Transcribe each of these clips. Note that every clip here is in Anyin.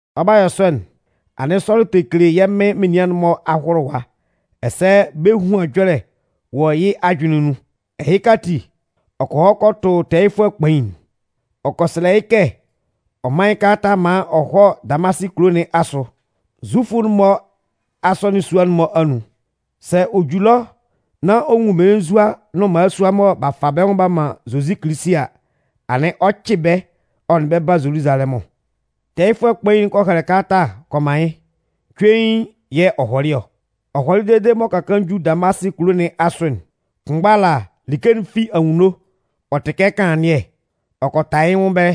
Ɔ 'ba yɔ sɔ'n, anɩn Sɔlʋ tɛ kele yɛ́ Mɩn menian'n-mɔ ahʋlʋwa ɛsɛ bɛ́ ehuan ɛjɔlɛ wɔ yɩ́ ajʋnlɩn nun. Ɛhɩka ati, ɔ kɔ hɔ kɔ tʋ tɛɛyɩfʋɛ kpain'n. Ɔ kɔ sɛlɛ yɩ́ kɛ ɔ mán yɩ́ kalata maan ɔ hɔ́ Damasɩ kulo nɩn asʋ, Zufʋ'n-mɔ asɔnɩn sua'n-mɔ anun. Sɛ ɔ ju ɛlɔ nán ɔ nwun mmelenzua nʋn mmalasua mɔ b'a fa bɛ́ nwʋn b'a man Zozi Kilisi a, anɩn ɔ 'cɩ bɛ́ ɔ nʋn bɛ́ ba Zoluzalɛmʋn. Tɛɛyɩfʋɛ kpain'n kɔ hɛlɛ kalata'n kɔ man yɩ́, cuein yɛ̂ ɔ hɔlɩ ɔ. Ɔ hɔlɩ dede m'ɔ ka kaan ju Damasɩ kulo nɩn asʋ'n, kʋnmgba ala, like'n fi anwunno, ɔ tɩ kɛ kanlannɩɛ, ɔ kɔ ta yɩ́ nwʋn ɛbɛlɛ.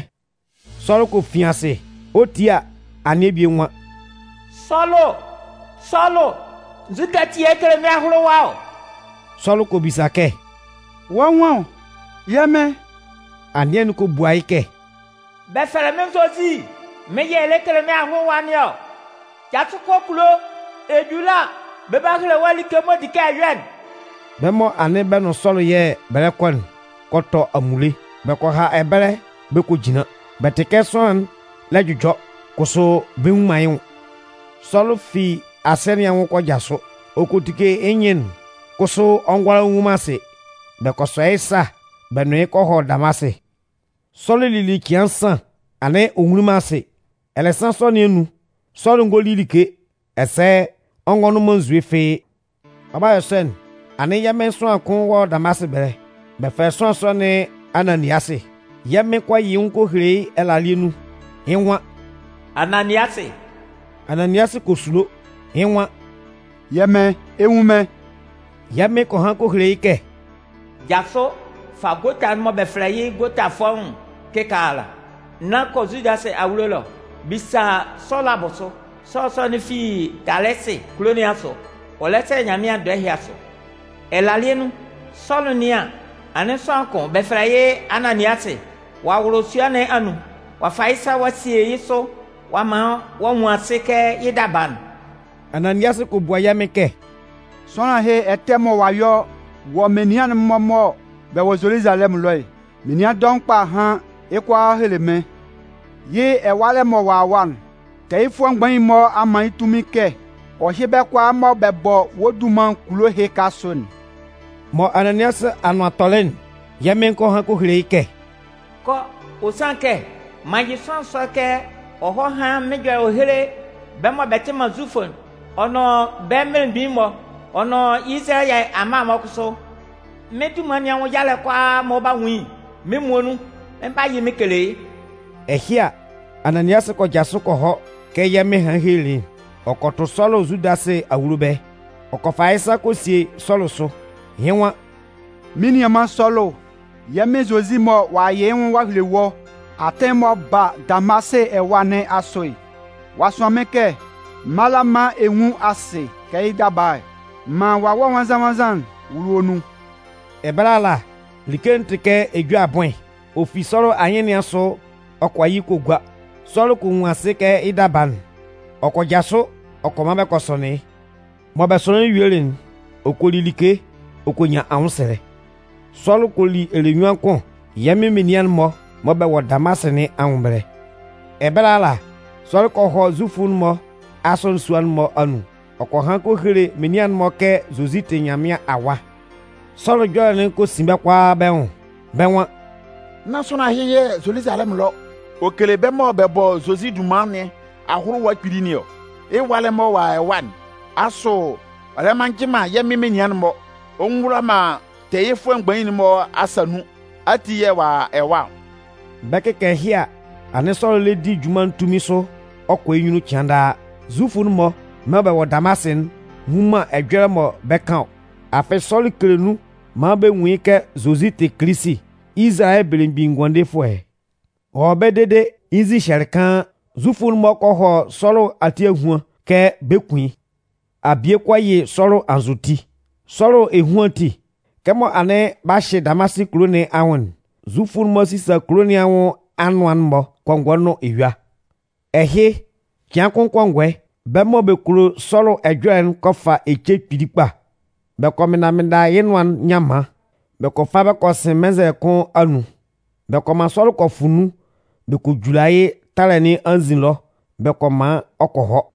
Sɔlʋ kɔ fin asɩ. Ɔ 'tie a, anɩɛ bie nwan: “Sɔlʋ, Sɔlʋ, nzukɛ ati yɛ̂ ɛ lɛ kele mɩ́n ahʋlʋwa ɔ?” Sɔlʋ kɔ bisa kɛ: “Wɔ́ nwan ɔ, yɛ́ Mɩn?” Anɩɛ'n kɔ bua yɩ́ kɛ: “Bɛ fɛlɛ mɩ́n Zozi. Mɩ́n yɛ̂ ɛ lɛ kele mɩ́n ahʋlʋwa nɩn ɔ. Jasʋ kɔ kulo. Ɛ ju ɛlɔ a, bɛ 'ba hele wɔ́ like'n m'ɔ di kɛ ɛ yɔ'n.” Bɛ́ mɔ anɩn bɛ nʋn Sɔlʋ yɛ̂ bɛ lɛ kɔ'n kɔ tɔ amunle, bɛ kɔ ha ɛbɛlɛ bɛ kɔ jinlan. Bɛ tɩ kɛ sʋanlan'n lɛ jʋjɔ, kʋsʋ bɛ nnwun man yɩ́ nwʋn. Sɔlʋ fi asɩɛ nɩn anwʋn ɔ kɔ jasʋ. Ɔ kɔ tike yɩ́ nyɩn'n kʋsʋ ɔ ngʋala ɔ nnwun man asɩ. Bɛ kɔ sɔ yɩ́ sa bɛ nʋn yɩ́ kɔ hɔ Damasɩ. Sɔlʋ lili cɩan nsan anɩn ɔ nwunlin man asɩ. Ɛlɛsan sɔ nɩn anun, Sɔlʋ ngo li like ɛsɛ ɔ ngɔ nʋn man nzue fɩ́ɩ́. Ɔ 'ba yɔ sɔ'n, anɩn yɛ́ Mɩn sʋanlan'n kʋn wɔ Damasɩ ɛbɛlɛ. Bɛ fɛlɛ sʋanlan sɔ nɩn Ananiasɩ. Yɛ́ Mɩn kɔ yɩ yɩ́ nwʋn kɔ hele yɩ́ ɛlalɩɛ nun. Yɩ́ nwan: “Ananiasɩ!” Ananiasɩ kɔ sulo. Yɩ́ nwan: “Yɛ́ Mɩn, ɛ 'nwun mɩ́n.” Yɛ́ Mɩn kɔ han kɔ hele yɩ́ kɛ: “Jasʋ, fa gota'n mɔ bɛ fɛlɛ yɩ́ ‘gota fɔ́ʋ́n'n’ kɩkaala, nán kɔ Zudasɩ awulo ɛlɔ. Bisa Sɔlʋ abʋsʋ. Sɔlʋ sɔ'n fi Talɩsɩ kulo nɩn asʋ. Ɔ lɛ sɛlɛ Nyanmɩan dɔɛ ɛhɩ asʋ. Ɛlalɩɛ nun, Sɔlʋ 'nɩan an, anɩn sʋanlan kʋn, bɛ fɛlɛ yɩ́ Ananiasɩ, ɔ'a wʋlʋ sua nɩn anun. Ɔ'a fa yɩ́ sa ɔ'a sie yɩ́ sʋ ɔ'a man ɔ'a nwun asɩ kɛ yɩ́ daba'n.” Ananiasɩ kɔ bua yɛ́ Mɩn kɛ: “Sʋanlan ɛhɩ ɛtɛ mɔ ɔ'a yɔ wɔ́ menian'n-mɔ mɔ bɛ wɔ Zoluzalɛmʋn ɛlɔ'n, menian dɔʋn kpa a han yɩ́ kʋalaa a hele mɩ́n. Yɩ́ ɛwalɛ mɔ ɔ'a a ɛwa'n, tɛɛyɩfʋɛ mgbain'n-mɔ a man yɩ́ tunmin kɛ ɔ hyɩ́ bɛ́ kʋalaa mɔ bɛ bɔ wɔ́ dunman kulo ɛhɩka asʋ'n.” Mɔ Ananiasɩ anʋan tɔlɩ'n, yɛ́ Mɩn kɔ han hɔ hele yɩ́ kɛ: “Kɔ, ɔ sanlɩn kɛ, m'an yɩ sʋanlan sɔ'n kɛ ɔ hɔ́ hán mɩ́n ɛjɔlɛ ɔ héle bɛ́ mɔ bɛ tɩ man Zufʋ'n ɔ nʋn bɛ́ mmelemgbin'n-mɔ, ɔ nʋn Izalayɛ amma'n-mɔ kʋsʋ. Mɩ́n dunman nɩn anwʋn yalɛ'n kʋalaa mɔ ɔ 'ba nwun yɩ́'n, mɩ́n muonun mɩn 'ba yɩ mɩn kele yɩ́.” Ɛhɩ a, Ananiasɩ kɔ jasʋ kɔ hɔ kɛ yɛ́ Mɩn hanlɩn helelɩ yɩ́'n. Ɔ kɔ tʋ Sɔlʋ Zudasɩ awulo ɛbɛlɛ. Ɔ kɔ fa yɩ́ sa kɔ sie Sɔlʋ sʋ. Yɩ́ nwan: “Mɩ́n nianman Sɔlʋ, yɛ́ Mɩn Zozi mɔ ɔ'a yɩ yɩ́ nwʋn ɔ'a hele wɔ́ atɩn'n m'ɔ ba Damasɩ ɛwa nɩn asʋ'n, ɔ'a sʋan mɩ́n kɛ m mála maan ɛ nwún asɩ kɛ yɩ́ daba'n, maan Wawɛ Nwannzan-nwannzan'n wʋ́lʋ wɔ́ nun.” Ɛbɛlɛ ala, like'n tɩ kɛ ejue abʋɩn, ɔ fi Sɔlʋ anyɩn nɩn asʋ ɔ kɔ yɩ kɔ gua. Sɔlʋ kɔ nwun asɩ kɛ yɩ́ daba'n. Ɔ kɔ jasʋ ɔ kɔ man bɛ kɔ sɔnɩn yɩ́. Mɔ bɛ sɔnɩnlɩn yɩ́ yuelɩ'n, ɔ kɔ li like ɔ kɔ nyan anwʋnsɛlɛ. Sɔlʋ kɔ li ɛlɛnyuan kʋn yɛ́ Mɩn menian'n-mɔ mɔ bɛ wɔ Damasɩ nɩn anwʋn ɛbɛlɛ. Ɛbɛlɛ ala, Sɔlʋ kɔ hɔ Zufʋ'n-mɔ asɔnɩn sua'n-mɔ anun, ɔ kɔ han kɔ hele menian'n-mɔ kɛ Zozi tɩ Nyanmɩan Awa. Sɔlʋ ɛjɔlɛ'n kɔ sin bɛ́ kʋalaa bɛ́ nwʋn. Bɛ́ nwan: “Nán sʋanlan ɛhɩ yɛ̂ Zoluzalɛmʋn ɛlɔ, ɔ kele bɛ́ mɔ bɛ bɔ Zozi dunman nɩn ahʋlʋwa kpili nɩn ɔ? Yɩ́ ɛwalɛ mɔ a a ɛwa'n, asʋ ɔ lɛ man njɩ man yɛ́ Mɩn menian'n-mɔ ɔ ngɔ wula man tɛɛyɩfʋɛ mgbain'n-mɔ asa nun ati yɛ̂ ɔ a a ɛwa ɔ?” Bɛ 'kɩkan ɛhɩ a, anɩn Sɔlʋ lɛ di junman'n tunmin sʋ ɔ kɔ yɩ́ nyunnun cɩan daa. Zufʋ'n-mɔ mɔ bɛ wɔ Damasɩ'n nnwun man ɛjɔlɛ mɔ bɛ kan ɔ. Afɩ Sɔlʋ kele nun maan bɛ nwun yɩ́ kɛ Zozi tɩ Kilisi, Izalayɛ Belemgbin Ngʋandefʋɛ. Ɔ wɔ ɛbɛlɛ dede yɩ́ nzin hyɛlɩ kaan. Zufʋ'n-mɔ kɔ hɔ Sɔlʋ ati ahuan kɛ bɛ 'kun yɩ́. Abie kɔ yɩ Sɔlʋ anzʋti. Sɔlʋ ehuan ati, kɛmɔ anɩn b'a hyɩ Damasɩ kulo nɩn anwʋn'n, Zufʋ'n-mɔ sisa kulo nɩn anwʋn anʋan'n-mɔ kɔngɔɛ nʋn eyua. Ɛhɩ, cɩan kʋn kɔngɔɛ, bɛ́ mɔ bɛ kulo Sɔlʋ ɛjɔlɛ'n kɔ fa ece kpili kpa. Bɛ kɔ mɩnnda mɩnnda yɩ́ nʋan'n nyanman, bɛ kɔ fa kɔ sɩn mɩnnzɛlɛ kʋn anun. Bɛ kɔ man Sɔlʋ kɔ fʋ nun bɛ kɔ jula yɩ́ talɛ nɩn anzin ɛlɔ bɛ kɔ man ɔ kɔ hɔ.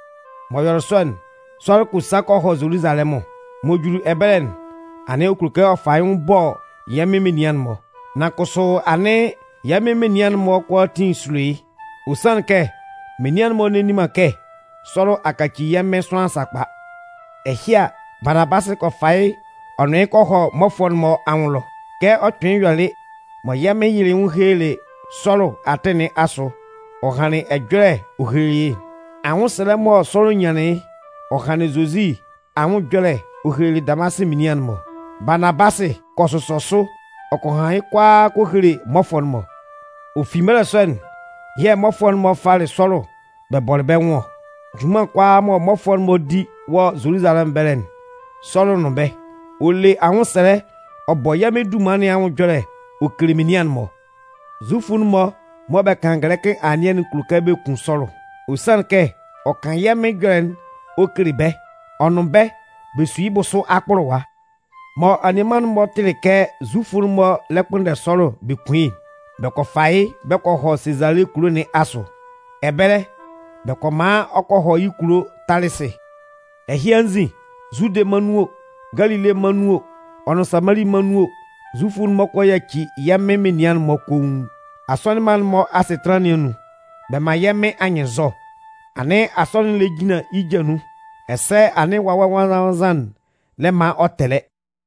M'ɔ yɔlɩ sɔ'n, Sɔlʋ kɔ sa kɔ hɔ Zoluzalɛmʋn. M'ɔ juli ɛbɛlɛ'n, anɩn ɔ kulo kɛ ɔ fa yɩ́ nwʋn ɔ bɔ yɛ́ Mɩn menian'n-mɔ. Nan kʋsʋ anɩn, yɛ́ Mɩn menian'n-mɔ kʋalaatin sulo yɩ́. Ɔ sanlɩn kɛ, menian'n-mɔ nne nni man kɛ Sɔlʋ a kaci yɛ́ Mɩn sʋanlan sakpa. Ɛhɩ a, Baanabasɩ kɔ fa yɩ́ ɔ nʋn yɩ́ kɔ hɔ mmɔfʋɛ'n-mɔ anwʋn ɛlɔ. Kɛ ɔ kpɩnlɩn yɔlɩ mɔ yɛ́ Mɩn yɩlɩ yɩ́ nwʋn helelɩ Sɔlʋ atɩn nɩn asʋ ɔ hanlɩn ɛjɔlɛ ɔ hele yɩ́'n, anwʋnsɛlɛ mɔ Sɔlʋ nyanlɩn yɩ́ ɔ hanlɩn Zozi anwʋn ɛjɔlɛ'n ɔ helelɩ Damasɩ menian'n-mɔ, Baanabasɩ kɔ sʋsɔ sʋ ɔ kɔ han yɩ́ kʋalaa kɔ hele mmɔfʋɛ'n-mɔ. Ɔ fi mɛlɛ sɔ'n, yɛ̂ mmɔfʋɛ'n-mɔ falɩ Sɔlʋ bɛ bɔlɩ bɛ́ nwʋn ɔ. Junman kʋalaa mɔ mmɔfʋɛ'n-mɔ 'di wɔ Zoluzalɛmʋn ɛbɛlɛ'n, Sɔlʋ nʋn bɛ́. Ɔ le anwʋnsɛlɛ ɔ bɔ yɛ́ Mɩn dunman nɩn anwʋn ɛjɔlɛ ɔ kele menian'n-mɔ. Zufʋ'n-mɔ mɔ bɛ kan gɛlɛkɩ anɩɛ'n kulo kɛ bɛ kun Sɔlʋ. Ɔ sanlɩn kɛ ɔ kan yɛ́ Mɩn ɛjɔlɛ'n ɔ kele bɛ́ ɔ nʋn bɛ́ bɛ su yɩ́ bʋsʋ akpʋlʋwa. Mɔ anianman'n-mɔ tɩlɩ kɛ Zufʋ'n-mɔ lɛ kpʋnndɛ Sɔlʋ bɛ kun yɩ́'n, bɛ kɔ fa yɩ́ bɛ kɔ hɔ Sezale kulo nɩn asʋ. Ɛbɛlɛ, bɛ kɔ man ɔ kɔ hɔ yɩ́ kulo Talɩsɩ. Ɛhɩ anzin, Zude mân nun o, Galile mân nun o, ɔ nʋn Samali mân anun o, Zufʋ'n-mɔ kɔ yaci yɛ́ Mɩn menian'n-mɔ koun. Asɔnɩn mma'n-mɔ asɩtanlan nɩn anun, bɛ man yɛ́ Mɩn anyɩnnzɔ. Anɩn asɔnɩn'n lɛ jinlan yɩ́ ja nun, ɛsɛ anɩn Wawɛ Nwannzan-nwannzan'n lɛ man ɔ tɛlɛ.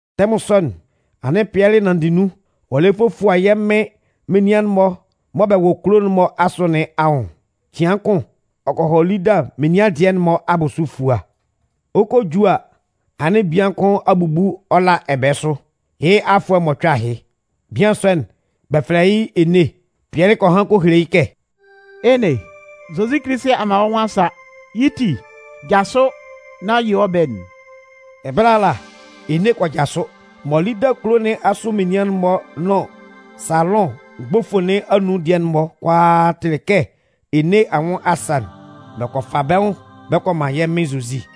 Tɛmʋn sɔ'n, anɩn Pɩɛlɩ nanndɩ nun ɔ lɛ fofua yɛ́ Mɩn menian'n-mɔ mɔ bɛ wɔ kulo kulo'n-mɔ asʋ nɩn anwʋn. Cɩan kʋn, ɔ kɔ hɔ Lida menian dɩɛ'n-mɔ abʋsʋ efua. Ɔ 'kɔ a ju a, anɩn bian kʋn a bubu ɔ la ɛbɛɛ sʋ, yɩ́ afʋɛ mɔcʋɛ ahɩ. Bian sɔ'n, bɛ fɛlɛ yɩ́ Ene. Pɩɛlɩ kɔ han kɔ hele yɩ́ kɛ: “Ene, Zozi Kilisi a man wɔ́ nwʋn a sa. Yɩ́ ti, jasʋ nán yɩ wɔ́ ɛbɛɛ'n.” Ɛbɛlɛ ala, Ene kɔ jasʋ. Mɔ Lida kulo nɩn asʋ menian'n-mɔ nʋn Saalʋn mgbofo nɩn anun dɩɛ'n-mɔ kʋalaa tɩlɩ kɛ Ene anwʋn a sa'n, bɛ kɔ fa bɛ́ nwʋn bɛ kɔ man yɛ́ Mɩn Zozi.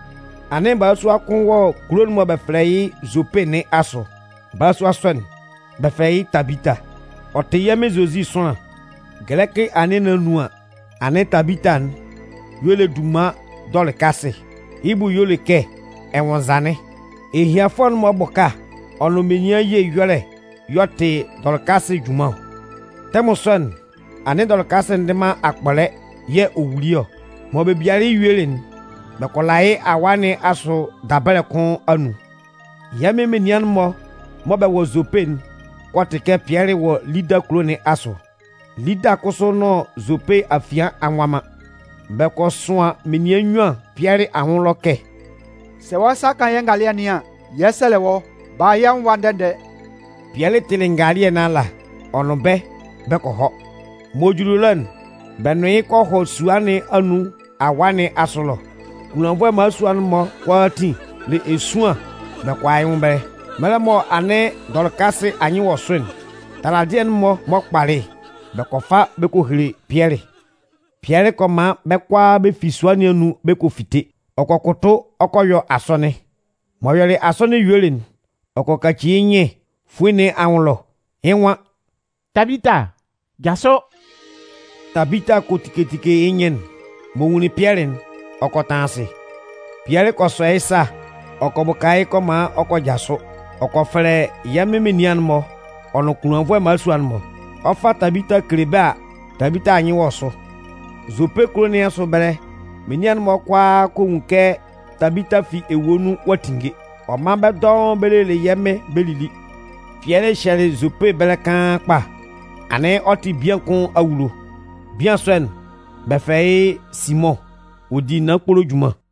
Anɩn balasua kʋn wɔ kulo'n mɔ bɛ fɛlɛ yɩ́ Zope nɩn asʋ. Balasua sɔ'n, bɛ fɛlɛ yɩ́ Tabita. Ɔ tɩ yɛ́ Mɩn Zozi sʋanlan. Gɛlɛkɩ anɩɛ nɩn anun an, anɩn Tabita'n y'ɔ le dunman Dɔlɩkasɩ, yɩ́ bʋ y'ɔ le kɛ ɛnwʋnnzanɩn. Ehianfʋɛ'n-mɔ ɛbʋka ɔ nʋn menian ye ɛyɔlɛ y'ɔ tɩ Dɔlɩkasɩ junman ɔ. Tɛmʋn sɔ'n, anɩn Dɔlɩkasɩ ndɩ man akpɔlɛ yɛ̂ ɔ wuli ɔ. Mɔ bɛ bialɩ yɩ́ yuelɩ'n, bɛ kɔ la yɩ́ awaa nɩn asʋ dabɛlɛ kʋn anun. Yɛ́ Mɩn menian'n-mɔ mɔ bɛ wɔ Zope'n kɔ tɩ kɛ Pɩɛlɩ wɔ Lida kulo nɩn asʋ. Lida kʋsʋ nʋn Zope afian a nwa man. Bɛ kɔ sʋan menian nnyuan Pɩɛlɩ anwʋn ɛlɔ kɛ: “Sɛ wɔ́ sa kan yɛ́ ngalɩɛ nɩn an, yɛ 'sɛlɛ wɔ́, bala yɛ́ nwʋn ɛwa ndɛ-ndɛ.” Pɩɛlɩ tɩlɩ ngalɩɛ nɩn ala, ɔ nʋn bɛ́ bɛ kɔ hɔ. M'ɔ juli ɛlɔ'n, bɛ nʋn yɩ́ kɔ hɔ sua nɩn anun awaa nɩn asʋ ɛlɔ. Kunlannvʋɛ mmalasua'n-mɔ kʋalaatin le esuan bɛ kɔ a yɩ́ nwʋn ɛbɛlɛ. Mɛlɛ mɔ anɩn Dɔlɩkasɩ anyɩn wɔ sʋ'n, taladɩɛ'n-mɔ m'ɔ kpalɩ'n, bɛ kɔ fa bɛ kɔ hele Pɩɛlɩ. Pɩɛlɩ kɔ man bɛ́ kʋalaa bɛ fi sua nɩn anun bɛ kɔ fite. Ɔ kɔ kʋtʋ ɔ kɔ yɔ asɔnɩn. M'ɔ yɔlɩ asɔnɩn yuelɩ'n, ɔ kɔ kaci yɩ́ nyɩn fuin nɩn anwʋn ɛlɔ, yɩ́ nwan: “Tabita, jasʋ!” Tabita kɔ tike tike yɩ́ nyɩn'n. M'ɔ nwunlin Pɩɛlɩ'n, ɔ kɔ tanlan asɩ. Pɩɛlɩ kɔ sɔ yɩ́ sa ɔ kɔ bʋka yɩ́ kɔ man ɔ kɔ jasʋ. Ɔ kɔ fɛlɛ yɛ́ Mɩn menian'n-mɔ ɔ nʋn kunlannvʋɛ mmalasua'n-mɔ. Ɔ 'fa Tabita kele bɛ́ a, Tabita a nyɩn wɔ sʋ. Zope kulo nɩn asʋ ɛbɛlɛ menian'n-mɔ kʋalaa kɔ nwun yɩ́ kɛ Tabita fi ewue nun ɔ'a tinnge. Ɔ man bɛ́ dɔʋn bɛ lelɩ yɛ́ Mɩn bɛ lili. Pɩɛlɩ hyɛlɩ Zope ɛbɛlɛ kaan kpa. Anɩn ɔ tɩ bian kʋn awulo. Bian sɔ'n, bɛ fɛlɛ yɩ́ Simʋn, ɔ di naan kpolo junman.